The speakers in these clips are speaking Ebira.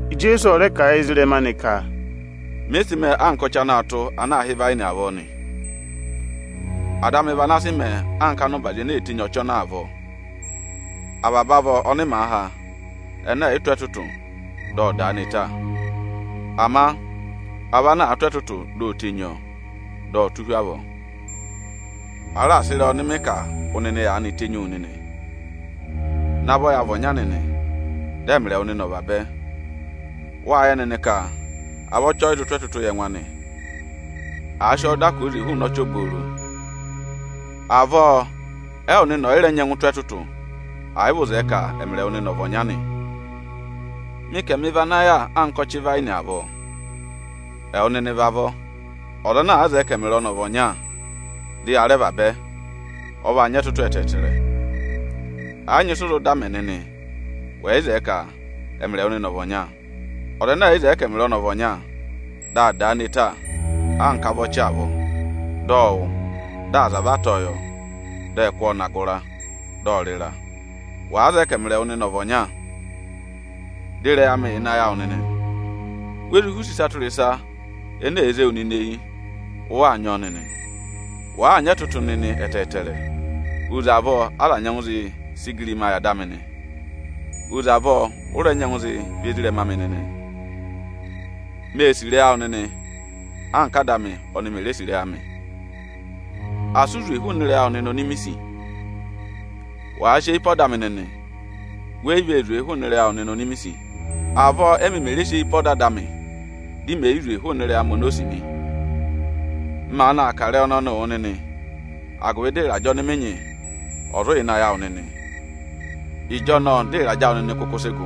Ijeesu ọ rẹ kà a yị ezirẹma anị ka, “Mị sị mẹẹ anka ọchị anaā tụ́ ana aā hị́ ịvayịnị avọọ nị. Ada amị vị ana sị mẹẹ anka ọza ana nyị ụbazị ene ee tenyii ọchị ọnọọ avọọ. Avaba avọ ọnị màa há, ẹnẹ ẹ̀ yị tụ́ ẹtụtụ, dị ọ dà a ne ta. Ama avọ ana àaa tụ́ ẹtụtụ, di o tenyi ọ, dị ọ̀ọ tụ́ hu avọọ. A raà sị ịrẹyị ọnị mị kà wụ nịnị aanị tenyi wu nịnị. Navọ ya vị ọnya nịnị, dị ẹmịrị ẹwụ nịnị ọ̀ vabẹ. Wâ yẹ nịnị ka avọ́ ọchị ẹ yị zụ tụ́ ẹtụtụ yị ẹngụ anị àa sị ọ dà hụụnị ọchị obooro. Avọọ ẹwụ nịnị ọ̀ yị mẹ̀ rẹ nyẹngụ nyị ẹtụtụ, ẹ̀ yị vị ụ zẹẹ ka ẹmịrị ẹwụ nịnị ọ̀ vị ọnya nị. “Mị ka ẹmị vị ana yà anka ọchị ịvayịnị avọọ. Ẹwụ nịnị vị avọ. Ọza ana àa zẹẹ ka ẹmịrị ọnị ọ̀ vị ọnya dị ya rẹ vabẹ, ọ vaa nyị ẹtụtụ ẹtẹẹtẹrẹ. Ẹ yị nyị ịsị ụ zụ dà mẹ nịnị, wẹ̀ yị zẹẹ ka ẹmịrị ẹwụ nịnị ọ̀ vị ọnya. Ọza ẹnẹ ẹ̀ yị zẹẹ ka ẹmịrị ọnị ọ̀ vị ọnya, dị a dà a ne ta anka avọ́ ọchị avọọ. Dị ọ wụ, dị aza va tọ̀ọ́ yọ, dị ẹ kụ́ wa va hi ịnị ịra, dị ẹ rị ịra. Wàa zẹẹ ka ẹmịrị ẹwụ nịnị ọ̀ vị ọnya, dị ịrẹyị amị yà ịnị ayị awụ nịnị nị, we zụ họ̀ use ịsa tụra ịsa ene èe zé wu nịnị eyi, ụ waa nyị ọọ nịnị. Wàa nyị ẹtụtụ nịnị ẹtẹẹtẹrẹ, ọ vaa mẹ ka aza ẹ̀ sị ụbanyị yị Ada amị nị; oze avọọ ụ rẹ nyẹngụ zị vị ezirẹma amị nịnị nị. Mê sì ịrẹyị awụ nịnị anka Áda amị ọnị mè re sì ịrẹyị amị. Asị ụ và hụụ nị ịrẹyị awụ nịnị oni mi sì! Wàa sị eyi pe ọda amị nịnị, wẹ yị vaa vàa hụụnị ịrẹyị awụ nịnị oni mi sì. Avọọ émi mè re sị eyi pe ọda Ada amị, dị mẹ̀ yị và hụụnị ịrẹyị amị oni o sì nị. M maanị aa kà ịrẹyị ọnọnịị wụ nịnị, agụvị dị ịrajẹ ọnị mị nyị, ọ̀ zụ và awụ nịnị, ịjọnọọ dị ịrajẹ awụ nịnị kụkụ sị gụ.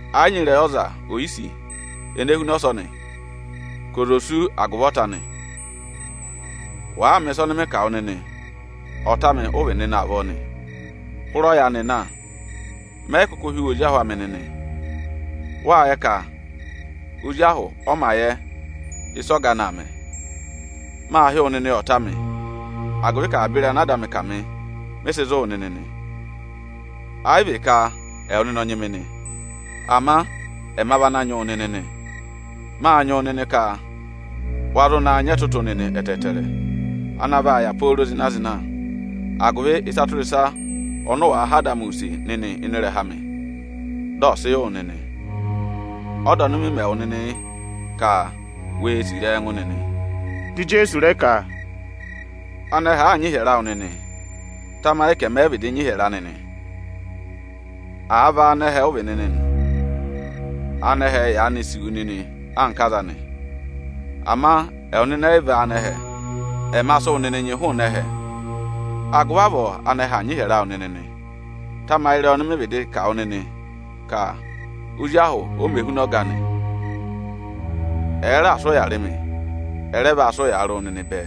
Ẹ yị nyị ịrẹyị ọza oyisì ene huna ọsọnị ka ọza ò sú agụvị ọta anị. Wàaa mẹ̀ ịsa ọnị mị kà wụ nịnị, ọta amị ụ vị nịnị avọọ nị. Hụrẹ ọyaanị na, mẹ yị kụkụ hị́ wụ ozi ahụ amị nịnị. Wâ yẹ ka ozi ahụ ọ mā yẹ ịsị ọga anị aa mẹ. Maa hị́ wụ nịnị ọta amị, agụvị ka avaba ịrẹyị ana Ada amị kà mị, mị sị zụ̀ wụ nịnị nị. Ẹ yị vị ka ẹwụ nịnị ọ nyị mị nị, ama ẹma vị ana nyị wụ nịnị nị. Mâ nyị wụ nịnị ka wa zụ naa nyị ẹtụtụ nịnị ẹtẹẹtẹrẹ ana vaa yà pooro zịna-zịna, agụvị ịsa tụra ịsa ọnị ụ wàa họ̀ Ada amị use nịnị ịnị ịrẹha amị, dị ọ̀ sị yị wụ nịnị. Ọda ọnị mị mẹ wụ nịnị yị ka: we sì ịrẹyị ẹngụ nịnị!” Dị Ijeesu rẹ ka, “Anẹhẹ àaa nyị ịhyẹrẹ awụ nịnị, tamayị ka ẹmị ẹ vịdị nyị ịhyẹrẹ anị nị. Àa vị áanẹhẹ ụ vị nịnị nị, anẹhẹ yaanị sì wu nịnị anka aza anị. Ama ẹwụ ẹ yị vị áanẹhẹ; ẹma sị ẹwụ nịnị nyị hụụnị ẹhẹ; agụvị avọọ ánẹhẹ aa nyị ịhyẹrẹ awụ nịnị nị. Tamayị ịrẹyị ọnị mị vịdị kà wụ nịnị ka ozi ahụ o mē huna ọga anị. Ẹ̀ẹ raà sị ụya rị mị, ẹ rẹ vaa sị ụyaa rị ẹwụ nịnị bẹẹ.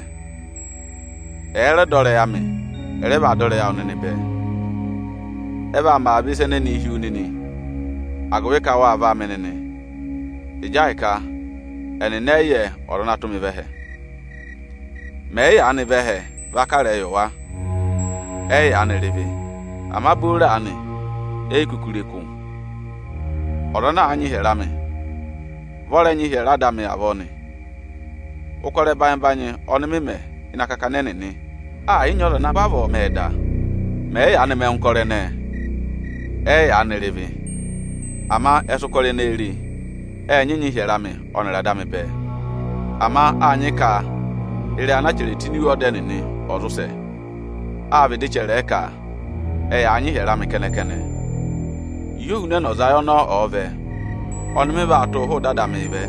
Ẹ̀ẹ dọ ịrẹyị amị, ẹ rẹ vaa dọ ịrẹyị ẹwụ nịnị bẹẹ. Ẹ vaa mẹ avaba ịsa ẹnẹẹ hi wu nịnị, agụvị ka wâ vị áamị nịnị, ịjị ahịka ẹnịnị ẹ yị yẹ Ọza ana tụ́ mị vẹ ẹhẹ. Mẹ̀ yị yaanị vẹ ẹhẹ va kà ịrẹyị yị wa, ẹ yị yaanị rị ịvị; ama booro aanị, e yi kuku re kụ́. Ọza ana àa nyị ịhyẹrẹ amị, vị ọ rẹ nyị ịhyẹrẹ Ada amị avọọ nị. Ụkọrọ ẹbanyị-ẹbanyị ọnị mị mẹ ịnị akakana ẹnịnị, ẹ̀ yị nyị ọza ana vavọọ mẹẹ da; mẹ̀ yị yaanị mẹ ẹngụ ụkọrọ ẹnẹẹ, ẹ yị yaanị rị ịvị. Ama ẹ sị ụkọrọ ẹnẹẹ re, ẹ nyị nyị ịhyẹrẹ amị ọnịrị Ada amị bẹẹ. Ama â nyị ka ịrẹyị ana a chẹrẹ tụ́ ini iwe ọda ẹnịnị, ọ̀ zụ sẹ. Â vịdị chẹrẹ ẹ ka: ‘Ẹyaa nyị ịhyẹrẹ amị kẹnẹ-kẹnẹ.’ “Ịhị Ohunẹnọzayị ọnọọ ọ̀ọ vẹ, ọnị mị vaa tụ́ hụụ ịdị Ada amịị vẹ,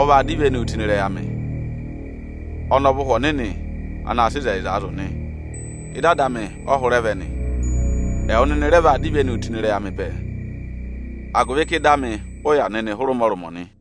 ọ vaa dọ ivenuu tụ́ ịnị ịrẹyị amị. Ọnị ọ vị Ụhwẹ Ọnịnị anaā sịị ịzẹyịzaa zụ̀ nị; ịdị Ada amị ọ hụrẹ vẹ nị. Ẹwụ nịnị rẹ vaa dọ ivenu tụ́ ịnị ịrẹyị amị bẹẹ, agụvị ka ịdị amị ụ yà nịnị hụrẹ ụmọrụmọ nị.